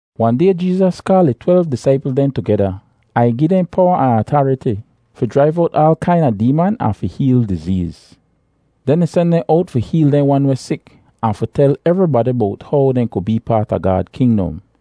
Wahn day Jeezas kaal ih twelv disaipl dehn tugeda ahn ih gi dehn powa ahn atariti fi jraiv owt aal kaina deeman ahn fi heel dizeez. Den ih sen dehn owt fi heel dehn wan weh sik ahn fi tel evribadi bowt how dehn ku bee paat a Gaad kingdom.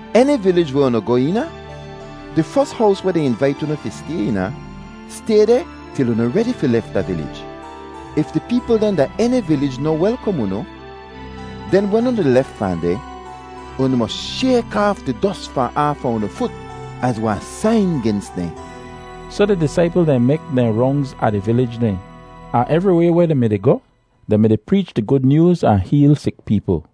Eni vilij weh unu goh eena, di fos hows weh dehn invait unu fi stay eena, stay deh til unu redi fi lef da vilij. If di peepl dehn da eni vilij noh welkom unu, den wen unu di lef fahn deh, unu mos shayk aaf di dos fahn aafa unu fut az wahn sain gens dehn.” Soh di disaipl dehn mek dehn rongz a di vilij dehn; ahn evriway weh dehn mi-di goh, dehn mi-di preech di Gud Nyooz ahn heel sik peepl.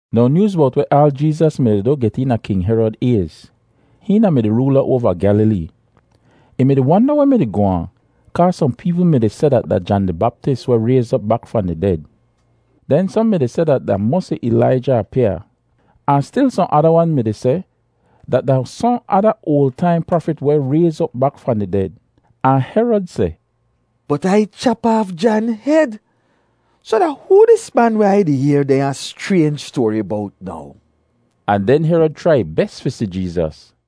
Now nyooz bowt weh aal Jeezas mi-di du get eena King Herod ayz. Hihn da-mi di roola oava Gyalilee. Ih mi-di wanda weh mi-di goh aan kaa sohn peepl mi-di seh dat da Jan di Baptis weh rayz op bak fahn di ded. Den sohn mi-di seh dat da mosi Ilaija apyaa, ahn stil sohn ada wan mi-di seh dat da sohn ada oal taim prafit weh rayz op bak fahn di ded. Ahn Herod seh, “Bot Ai chap aaf Jan hed. Soh da hoo dis man weh Ai di yehr dehnya schraynj stoari bowt now?” Ahn den Herod chrai ih bes fi si Jeezas.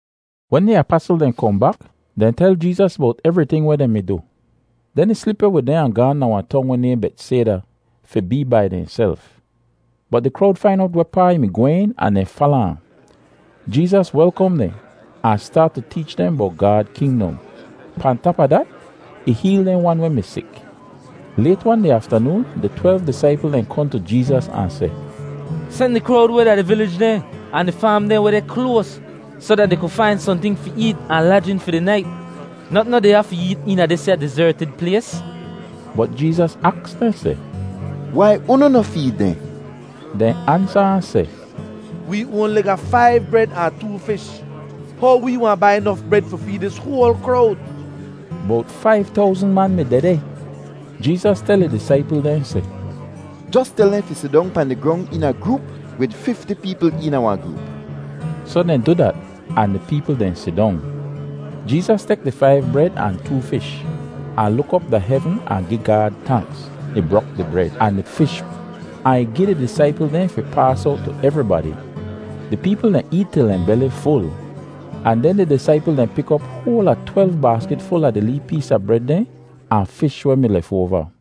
Wen di apasl dehn kohn bak, dehn tel Jeezas bowt evriting weh dehn mi du. Den ih slip weh wid dehn ahn gaahn da wahn tong weh nayhn Betsayda fi bee bai dehnself. Bot di krowd fain owt wehpaa ih mi gwehn ahn dehn fala ahn. Jeezas welkom dehn ahn staat tu teech dehn bowt Gaad kingdom; pahn tap a dat, ih heel dehn wan weh mi sik. Layt-wan di aftanoon di twelv disaipl dehn kohn tu Jeezas ahn seh, “Sen di krowd weh da di vilij dehn ahn di faam dehn weh deh kloas soh dat dehn ku fain sohnting fi eet ahn lajin fi di nait. Notn noh deh ya fi eet eena disya dizertid plays.” Bot Jeezas aks dehn seh, “Wai unu noh feed dehn?” Dehn ansa ahn seh, “Wee oanli ga faiv bred ahn too fish. How wee wahn bai nof bred fi feed dis hoal krowd?” (Bowt faiv towzn man mi dehdeh.) Jeezas tel ih disaipl dehn seh, “Jos tel dehn fi sidong pahn di grong eena groop wid fifti peepl eena wahn groop.” Soh dehn du dat, ahn di peepl dehn sidong. Jeezas tek di faiv bred ahn too fish, ahn luk op da hevn ahn gi Gaad tanks. Ih brok di bred ahn di fish, ahn ih gi di disaipl dehn fi paas owt tu evribadi. Di peepl dehn eet til dehn beli ful, ahn den di disaipl dehn pik op hoal a twelv baaskit ful a di lee pees a bred dehn ahn fish weh mi lefoava.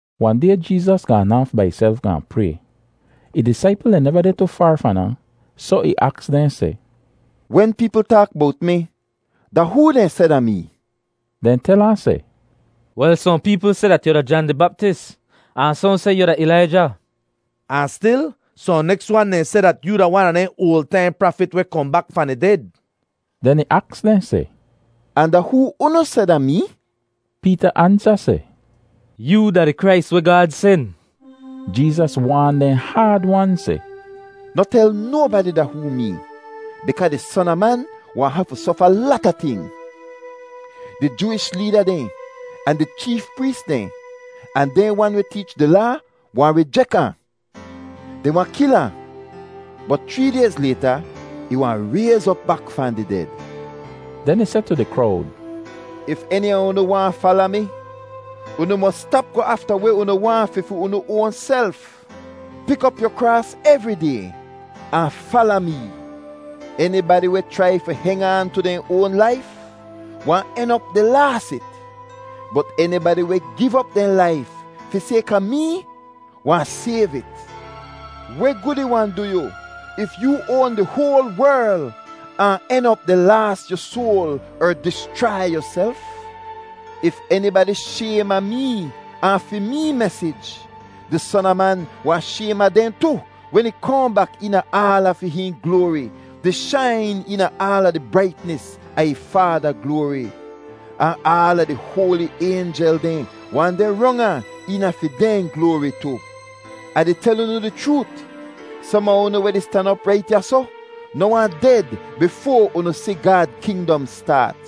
Wahn day Jeezas gaan aaf bai ihself gaahn pray. Ih disaipl dehn neva deh tu faar fahn ahn, soh ih aks dehn seh, “Wen peepl taak bowt mi, da hoo dehn seh da mee?” Dehn tel ahn seh, “Wel, sohn peepl seh dat yu da Jan di Baptis, ahn sohn seh yu da Ilaija, ahn stil sohn neks wan dehn seh dat yoo da wan a dehn oal taim prafit weh kohn bak fahn di ded.” Den ih aks dehn seh, “Ahn da hoo unu seh da mee?” Peeta ansa seh, “Yoo da di Krais weh Gaad sen.” Jeezas waan dehn haad-wan seh, “Noh tel nobadi da hoo mee bikaa di Son a Man wahn hafu sofa lata ting. Di Jooish leeda dehn, ahn di cheef prees dehn, ahn dehn wan weh teech di Laa wahn rijek ahn. Dehn wahn kil ahn, bot chree dayz layta, ih wahn rayz op bak fahn di ded!” Den ih seh tu di krowd, “If eni a unu waahn fala mi, unu mos stap goh afta weh unu waahn fi fi unu oanself. Pik op yu kraas evri day ahn fala mee. Enibadi weh chrai fi heng aan tu dehn oan laif wahn en op di laas it, bot enibadi weh giv op dehn laif fi sayka mee wahn sayv it. Weh gud ih wahn du yu if yoo oan di hoal werl ahn en op di laas yu soal er dischrai yuself? If enibadi shaym a mee ahn fi mee mesij, di Son a Man wahn shaym a dehn tu wen ih kohn bak eena aala fi hihn gloari, di shain eena aala di braitnis a ih Faada gloari. Ahn aala di hoali aynjel dehn wahn deh rong ahn eena fi dehn gloari tu. Ah di tel unu di chroot, som a unu weh di stan op rait ya soh, noh wahn ded bifoa unu si Gaad kingdom staat.”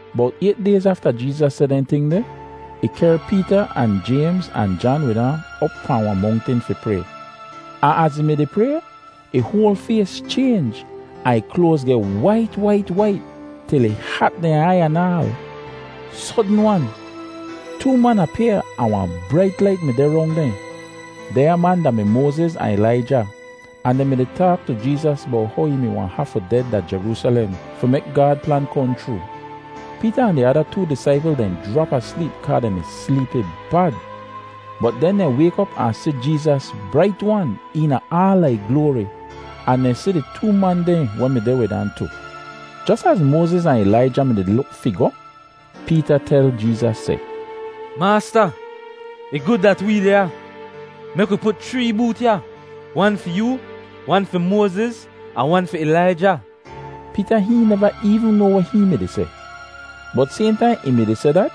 Bowt ayt dayz afta Jeezas seh dehn ting deh, ih kehr Peeta ahn Jaymz, ahn Jan wid ahn op pahn wahn mongtin fi pray. Ahn az ih mi-di pray, ih hoal fays chaynj ahn ih kloaz geh wait wait wait til ih hat dehn aiy anaal. Sodn-wan, too man apyaa ahn wahn brait lait mi deh rong dehn. Dehnya man da-mi Moaziz ahn Ilaija, ahn dehn mi-di taak tu Jeezas bowt how ih mi wahn hafu ded da Jeroosalem fi mek Gaad plan kohn chroo. Peeta ahn di ada too disaipl dehn jrap asleep kaa dehn mi sleepi bad, bot den dehn wayk op ahn si Jeezas brait-wan eena aala ih gloari, ahn dehn si di too man dehn weh mi deh wid ahn tu. Jos az Moaziz ahn Ilaija mi-di luk fi goh, Peeta tel Jeezas seh, “Maasta, ih gud dat wee deh ya. Mek wi put chree boot ya, wan fi yoo, wan fi Moaziz, ahn wan fi Ilaija.” Peeta hihn neva eevn noa weh hihn mi-di seh. Bot sayhn taim ih mi-di seh dat,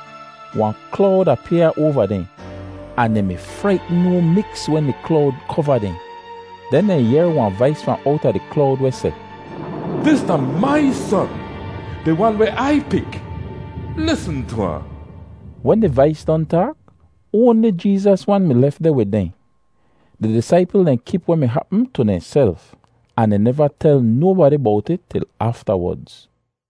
wahn klowd apyaa oava dehn, ahn dehn mi fraitn no miks wen di klowd kova dehn. Den dehn yehr wahn vais fahn owta di klowd weh seh, “Dis da mai Son, di Wan weh Ai pik. Lisn tu ahn.” Wen di vais don taak, oanli Jeezas wan mi lef deh wid dehn. Di disaipl dehn kip weh mi hapm tu dehnself, ahn dehn neva tel nobadi bowt it til aftawodz.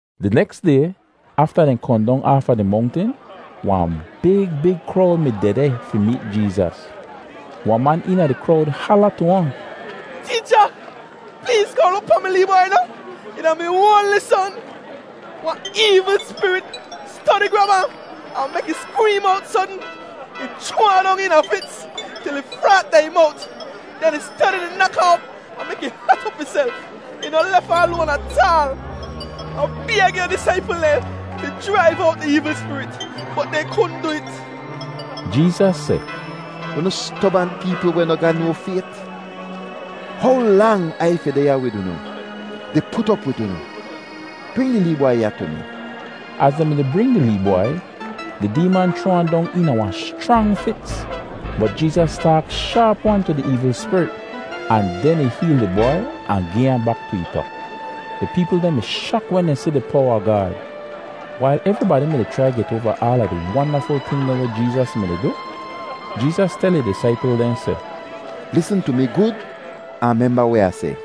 Di neks day, afta dehn kohn dong aafa di mongtin, wahn big big krowd mi dehdeh fi meet Jeezas. Wahn man eena di krowd hala tu ahn, “Teecha, pleez kohn luk pahn mi lee bwai noh? Ih da mi oanli son. Wahn eevl spirit stodi grab ahn, ahn mek ih skreem owt sodn. Ih chroa ahn dong eena fits til ih fraat da ih mowt. Den ih stodi di nak ahn op ahn mek ih hat op ihself. Ih noh lef ahn loan ataal. Ah bayg yu disaipl dehn fi jraiv owt di eevl spirit, bot dehn kudn du it.” Jeezas seh, “Unu stobant peepl weh noh ga no fayt! How lang Ai fi deh ya wid unu, di put op wid unu? Bring di lee bwai ya tu mi.” Az dehn mi-di bring di lee bwai, di deeman chroa ahn dong eena wahn schrang fits. Bot Jeezas taak shaap-wan tu di eevl spirit ahn den ih heel di bwai ahn gi ahn bak tu ih pa. Di peepl dehn mi shak wen dehn si di powa a Gaad. Wail evribadi mi-di chrai get oava aala di wandaful ting dehn weh Jeezas mi-di du, Jeezas tel ih disaipl dehn seh, “Lisn tu mi gud ahn memba weh Ah seh.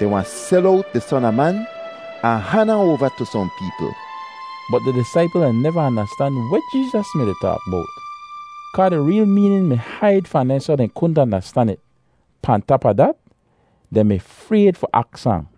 Dehn wahn sel owt di Son a Man ahn han ahn oava tu sohn peepl.” Bot di disaipl dehn neva andastan weh Jeezas mi-di taak bowt kaa di reel meenin mi haid fahn dehn soh dat dehn kudn andastan it. Pahn tap a dat, dehn mi frayd fi aks ahn.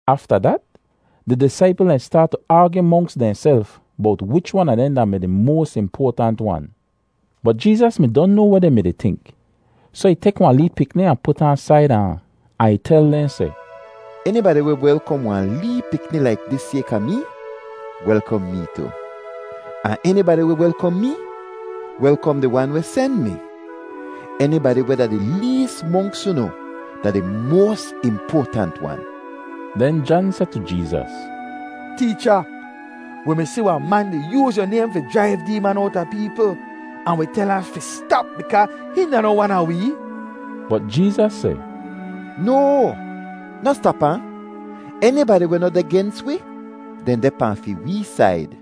Afta dat, di disaipl dehn staat tu aagyu monks dehnself bowt wich wan a dehn da-mi di moas impoatant wan. Bot Jeezas mi don noa weh dehn mi-di tink, soh ih tek wahn lee pikni ahn put ahn saida ahn, ahn ih tel dehn seh, “Enibadi weh welkom wahn lee pikni laik dis sayka mee, welkom mee tu, ahn enibadi weh welkom mee, welkom di Wan weh sen mi. Enibadi weh da di lees monks unu da di moas impoatant wan.” Den Jan seh tu Jeezas, “Teecha, wi mi si wahn man di yooz yu naym fi jraiv deeman owta peepl, ahn wi tel fi stap bikaa hihn da noh wan a wee.” Bot Jeezas seh, “No! Noh stap ahn! Enibadi weh noh deh gens wi, dehn deh pahn fi wee said.”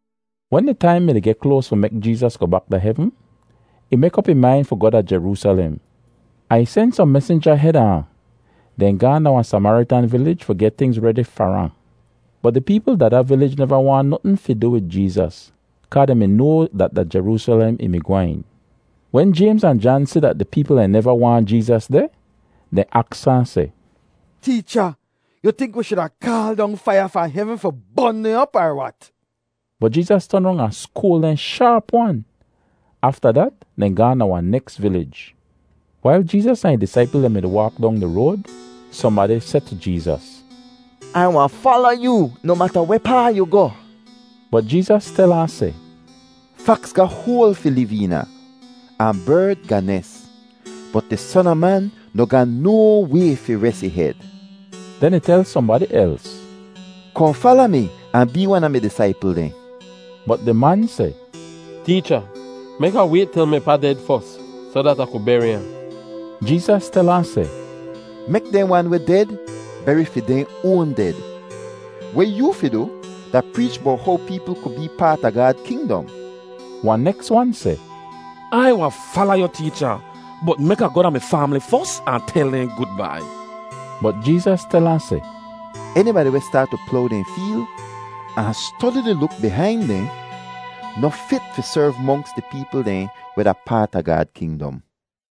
Wen di taim mi-di geh kloas fi mek Jeezas goh bak da hevn, ih mek op ih main fi goh da Jeroosalem, ahn ih sen sohn mesinja heda ahn. Dehn gaahn da wahn Samaritan vilij fi geh tingz redi far ahn. Bot di peepl da da vilij neva waahn notn fi du wid Jeezas kaa dehn mi noa dat da Jeroosalem ih mi gwehn. Wen Jaymz ahn Jan si dat di peepl dehn neva waahn Jeezas deh, dehn aks ahn seh, “Teecha, yu tink wi shuda kaal dong faiya fahn hevn fi bon dehn op, er wat?” Bot Jeezas ton rong ahn skoal dehn shaap-wan. Afta dat dehn gaahn da wahn neks vilij. Wail Jeezas ahn ih disaipl dehn mi-di waak dong di road, sohnbadi seh tu Jeezas, “Ai wahn fala yoo noh mata wehpaa yu goh.” Bot Jeezas tel ahn seh, “Faks ga hoal fi liv eena, ahn berd ga nes, bot di Son a Man noh ga no way fi res ih hed.” Den ih tel sohnbadi els, “Kohn fala mi ahn bee wan a mi disaipl dehn.” Bot di man seh, “Teecha, mek Ah wayt til mi pa ded fos, soh dat Ah ku beri ahn.” Jeezas tel ahn seh, “Mek dehn wan weh ded beri fi dehn oan ded. Weh yoo fi du da preech bowt how peepl ku bee paat a Gaad kingdom.” Wahn neks wan seh, “Ai wahn fala yu, Teecha, bot mek Ah goh da mi faamli fos ahn tel dehn gudbai.” Bot Jeezas tel ahn seh, “Enibadi weh staat tu plow dehn feel ahn stodi di luk bihain dehn, noh fit fi serv monks di peepl dehn weh da paat a Gaad kingdom.”